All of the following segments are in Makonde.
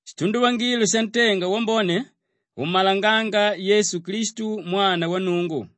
Shitunduvangilo shantenga wambone ummalangánga Yesu Klistu Mwana wa Nnungu.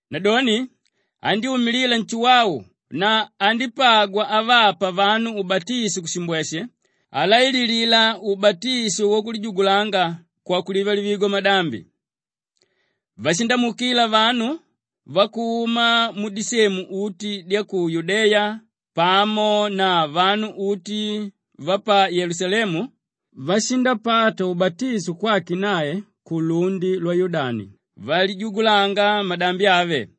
Nadoni andyúmilila Nshuwau na andípagwa avapa vanu ubatisho kushimbweshe alaililila ubatisho wakulijugulanga kwakulivalivigwa kwamadambi. Vashindamuukila vanu vakuma mudisemu uti dya ku Yudeya pamo na vanu uti va pa Yelusalemu, vashindapata ubatisho kwake nae kulundi lwa Yudani valijugulanga madambi ave.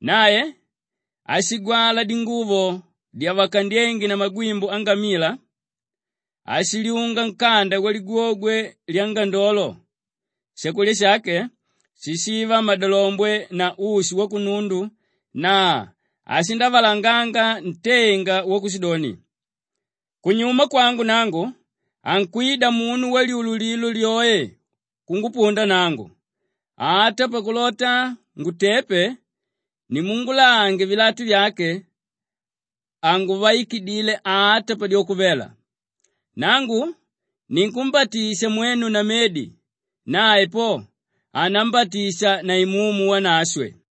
Nae ashigwala dinguvo dyavakandyenge na magwimbu angamila, ashilyunga nkanda waligwogwe lyangandolo, shakulya shake shishiva madalombwe na ushi wakunundu na ashindavalanganga ntenga wakushidoni, “Kunyuma kwangu nangu, ankwida munu walyululilo lyoe kungupunda nangu; ata pakulota ngutepe nimulange vilatu vyake, hanguvaikidile ata padyoko vela. Nangu ninkumbatisha mwenu na medi; nae po, anambatisha na Imumu Wanashwe.”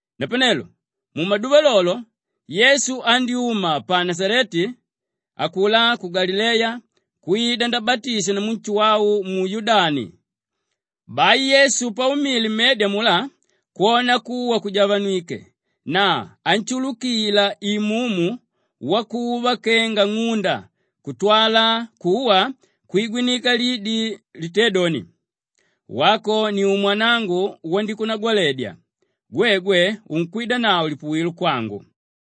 Napanelo mumaduva lolo lo, Yesu andyúma pa Nashaleti, akulá ku Galileya kwida ndabatishwa namu Nshuwau mu Yudani. Bai Yesu paumile mmedi amulá kwona kuwa kujavanwike na anshulukila Imumu wakuva kenga ng'unda kutwala kuwa kwigwinika lidi litédoni, “Wako ni umwanangu wanikunagwaledya, gwegwe unkwidanavo lipuwilo kwangu.”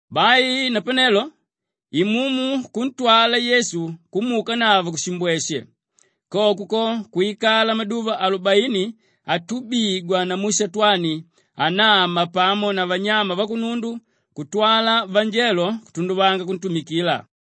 Bai napanelo Imumu kuntwala Yesu kumuukanavo kushimbweshe; koko ko kwikala maduva alubaini atubigwa namu Shatwani anama pamo na vanyama vakunundu kutwala vanjelo kutunduvanga kuntumikila.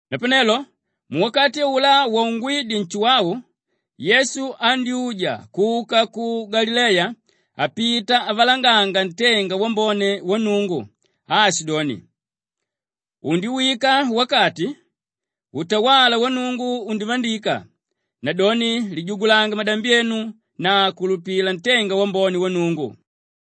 Napanelo muwakati aulá waungwídye Nshuwau Yesu andyúja kuka ku Galileya apita avalanganga ntenga wambone wa Nnungu aashidoni, “Undiwika wakati, utawala wa Nnungu undivandika nadoni lijugulange madambi enu na kulupila ntenga wambone wa Nnungu.”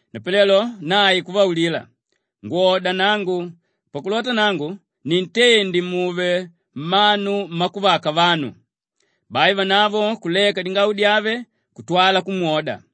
Napanelo nae kuvaulila, “Ngwoda nangu pakulota nangu nintende muve mmanu mmakuvaka vanu.” Bai vanavo kuleka dingau dyave kutwala kumwoda.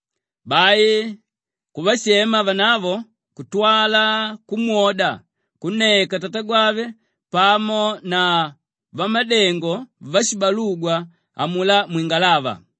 Bai kuvashema vanavo kutwala kumwoda kunneka tatagwave pamo na vamadengo vashibalugwa amulá mwingalava.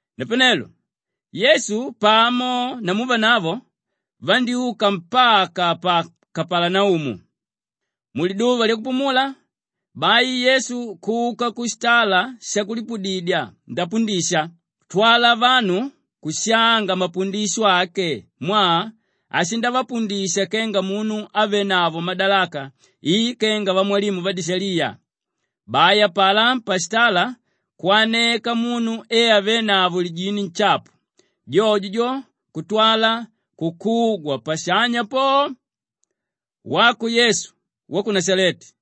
Napanelo Yesu pamo namu vanavo vandyúka mpaka pa Kapalanaumu. Muliduva lyakupumula, bai Yesu kuka kushitala shakulipudidya ndapundisha kutwala vanu kushanga mapundisho ake mwaa ashindavapundisha kenga munu ávenavo madalaka i kenga vamwalimu vadishaliya. Bai apalá pashitala kwaneka munu e avénavo lijini nshapu; jojo jo kutwala kukugwa pashanya po, “Wako Yesu wa ku Nashaleti,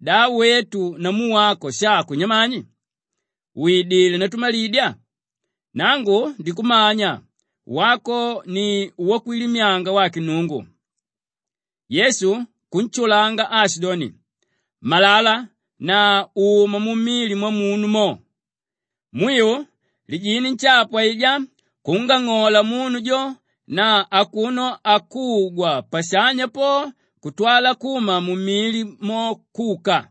da wetu namu wako shako nyamani? Widilé ndatumalidya? Nangu ndikumanya, wako ni wakwilimyanga wake Nnungu.” Yesu kunshulanga aashidoni, “Malala na uma mumili mwamunu mo!” Mwiu lijini nshapu aijá kungang'ola munu jo na akuno akugwa pashanya po kutwala kuma mumili mo kuka.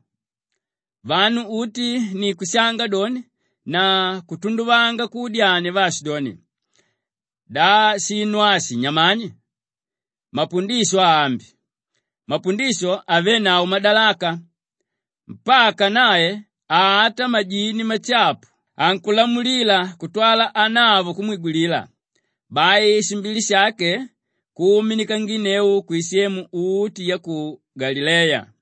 Vanu uti ni kushanga doni na kutunduvanga kuudyania vaashidoni, “Da shinu ashi nyamani? Mapundisho aambi! Mapundisho avénavo madalaka! Mpaka nae ata majini mashapu ankulamulilila kutwala anavo kumwigwilila.” Bai shimbili shake kuumanginneu kwisemu uti ya ku Galileya.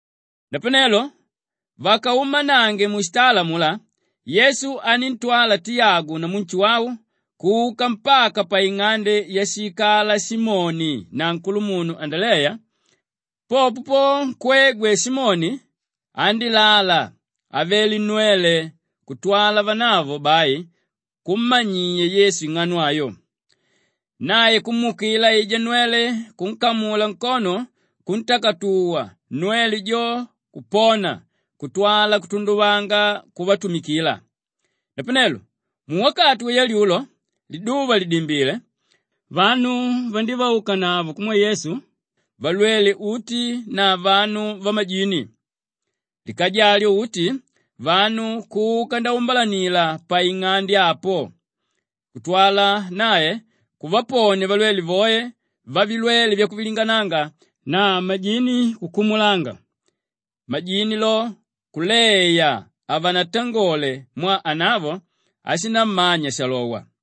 Napanelo vakaumanange mushitala amulá, Yesu aníntwala Tiyagu namu Nshuwau kuka mpaka paing'ande yashiikala Simoni na nkulumunu Andaleya. Popo nkwegwe Simoni andílala avele nnwele kutwala vanavo bai kummanyiya Yesu ing'ano ayo. Nae kumuukila aijá nnwele kunkamula nkono, kuntakatuwa, nnwele jo kupona kutwala kutunduvanga kuvatumikila. Napanelo muwakati wayalyulo liduva lìdimbile, vanu vandívaukanavo kumwe Yesu valwele uti na vanu vamajini. Likaja alyo uti vanu kuka naumbalanila paing'ande apo kutwala nae kuvaponia valwele voe vavilwele vyakuvilingananga na majini kukumulanga; majini lo kuleya hanatangole mwaa anavo ashinammanya shalowa.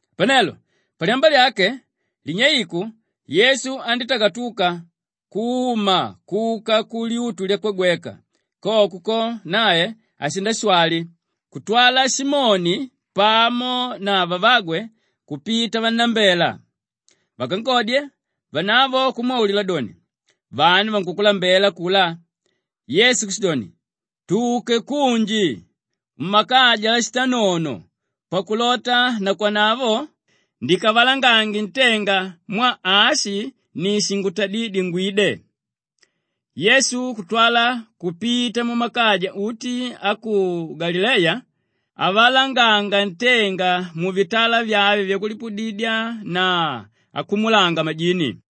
Napanelo palyamba lyake, linyeiku, Yesu andítakatuka kuma kuka kulyutu lyakwagweka; koko ko nae ashindashwali kutwala Simoni pamo na vavagwe kupita vannambela. Vakankodye, vanavo kumwaulila doni, “Vanu vankukulambela akulá!” Yesu kushidoni, “Tuke kunji kumakaja ashitanono pakulota nakwanavo ndikavalangange ntenga mwaa ashi ni shingutadídye ngwide.” Yesu kutwala kupita mumakaja uti a ku Galileya avalanganga ntenga muvitala vyave vyakulipudidya na akumulanga majini.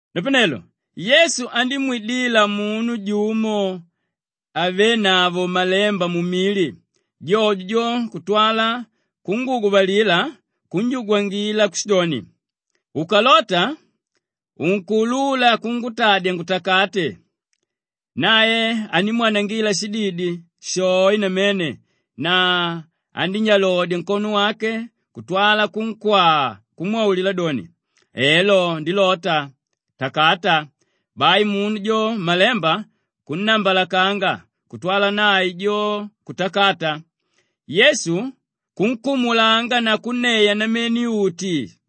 Napanelo Yesu andímwidila munu jumo ávenavo malemba mumili, jojo jo kutwala kunguguvalila kunjugwangila kushidoni, “Ukalota, unkuulula kungutadya ngutakate.” Nae andímwanangila shididi shoe namene na andínyalodya nkono wake kutwala kunkwaa kumwaulila doni, “Elo ndilota, takata!” Bai munu jo malemba kunnambalakanga kutwala nae jo kutakata. Yesu kunkumulanga na kunneya namene uti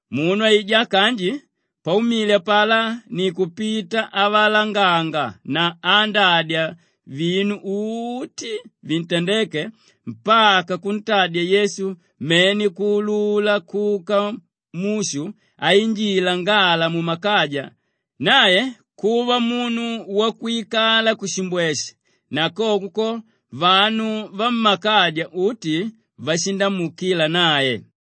Munu aijá kanji paumile apalá ni kupita avalanganga na aandadya vinu uti vintandéke mpaka kuntadya Yesu mene kuulula kuka mushu ainjila ngala mumakaja; nae kuva munu wakwikala kushimbweshe na koko ko vanu vammakaja uti vashindamuukila nae.